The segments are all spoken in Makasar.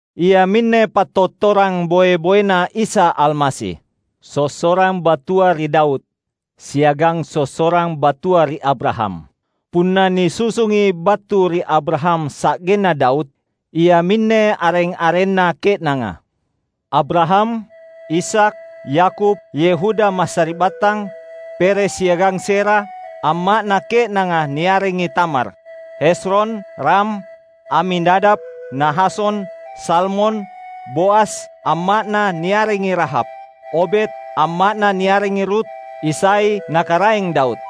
Iaminne pattottorang boe-boeNa Isa Almasi, sossorang battua ri Daud, siagang sossorang battua ri Abraham. Punna nisusungi battu ri Abraham sa’genna Daud, iaminne areng-arenna ke’nanga: Abraham, Ishak, Yakub, Yehuda massari’battang, Peres siagang Zerah (amma’na ke’nanga niarengi Tamar), Hezron, Ram, Aminadab, Nahason, Salmon, Boas (amma’na niarengi Rahab), Obed (amma’na niarengi Rut), Isai, na Karaeng Daud.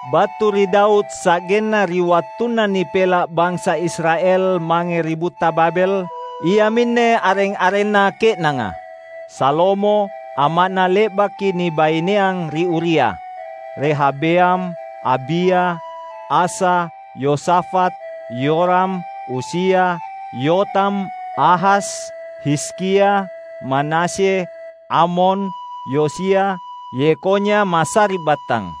(1:6b-11) Battu ri Daud sa’genna ri wattunna nipela’ bansa Israel mange ri butta Babel, iaminne areng-arenna ke’nanga: Salomo (amma’na le’baki nibaineang ri Uria), Rehabeam, Abia, Asa, Yosafat, Yoram, Uzia, Yotam, Ahas, Hizkia, Manasye, Amon, Yosia, Yekhonya massari’battang.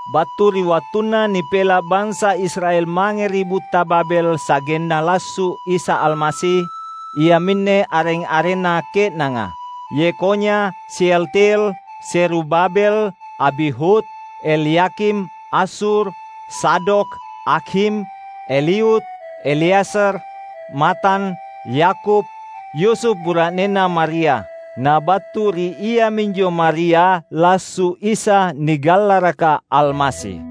Battu ri wattunna nipela’ bansa Israel mange ri butta Babel sa’genna lassu’ Isa Almasi, iaminne areng-arenna ke’nanga: Yekhonya, Sealtiel, Zerubabel, Abihud, Elyakim, Azur, Zadok, Akhim, Eliud, Eleazar, Matan, Yakub, Yusuf bura’nenna Maria. Na battu ri iaminjo Maria lassu’ Isa nigallaraka Almasi.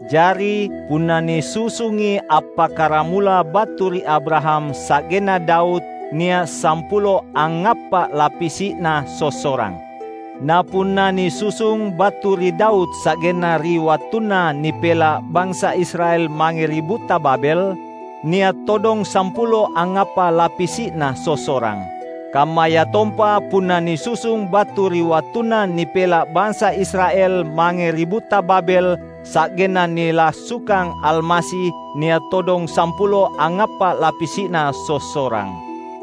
Jari, punna nisusungi appakkaramula battu ri Abraham sa’genna Daud nia’ sampulo angngappa’ lapisi’na sossorang. Na punna nisusung battu ri Daud sa’genna ri wattunna nipela’ bansa Israel mange ri butta Babel nia’ todong sampulo angngappa’ lapisi’na sossorang. Kammayatompa punna nisusung battu ri wattunna nipela’ bansa Israel mange ri butta Babel sa’genna nilassukang Almasi nia’ todong sampulo angngappa’ lapisi’na sossorang.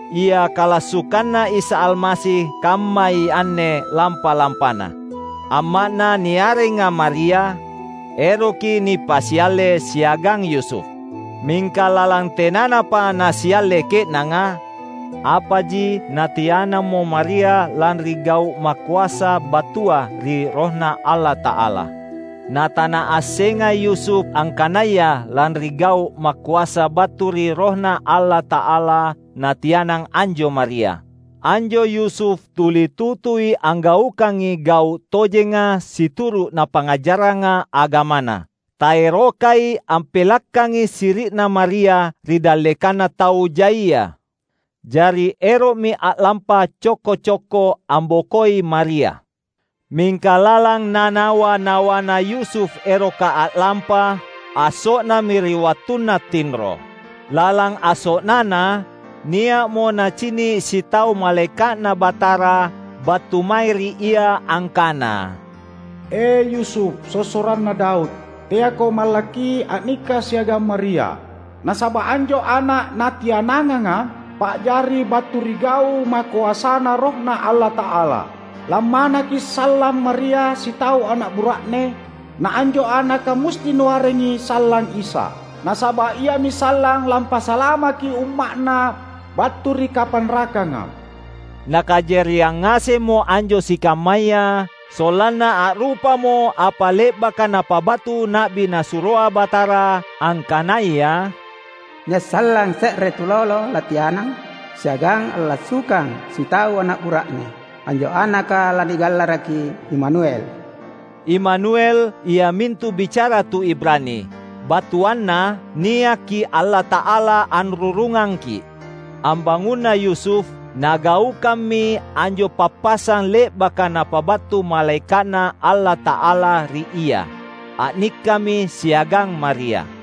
Ia kalassukanNa Isa Almasi kammai anne lampa-lampana. Amma’Na niarenga Maria, eroki nipasialle siagang Yusuf. Mingka lalang tenanapa nasialle ke’nanga, apaji natianammo Maria lanri gau’ makoasa battua ri RohNa Allata’ala. Na tanaassenga Yusuf angkanaya lanri gau’ makoasa battu ri RohNa Allata’ala natianang anjo Maria. Anjo Yusuf tuli tutui anggaukangi gau’ tojenga situru’ napangngajarranga agamana. Taerokai ampelakkangi siri’na Maria ri dallekanna tau jaia. Jari ero’mi a’lampa cokko-cokko ambokoi Maria. Mingka lalang nanawa-nawana Yusuf eroka a’lampa, asso’nami ri wattunna tinro. Lalang asso’nana, nia’mo nacini’ sitau malaeka’Na Batara battu mae ri ia angkana, "E, Yusuf, sossoranna Daud, teako mallakki a’nikka siagang Maria; nasaba’ anjo ana’ natiananganga, pa’jari battu ri gau’ makoasaNa RohNa Allata’ala. Lammanaki sallang Maria sitau ana’ bura’ne. Na anjo anaka musti nuarengi sallang Isa, nasaba’ Iami sallang lampasalamaki umma’Na battu ri kapanrakanga." Nakajariang ngasemmo anjo sikammaya sollanna a’rupamo apa le’baka napabattu na’bi Nasuroa Batara, angkanaya, "Nia’ sallang se’re tulolo latianang siagang allassukang sitau ana’ bura’ne. Anjo anaka lanigallaraki Imanuel." (Imanuel iamintu bicara tu Ibrani, battuanna "Niaki Allata’ala anrurungangki’".) Ambangunna Yusuf, nagaukammi anjo pappasang le’baka napabattu malaeka’Na Allata’ala ri ia. A’nikkami siagang Maria.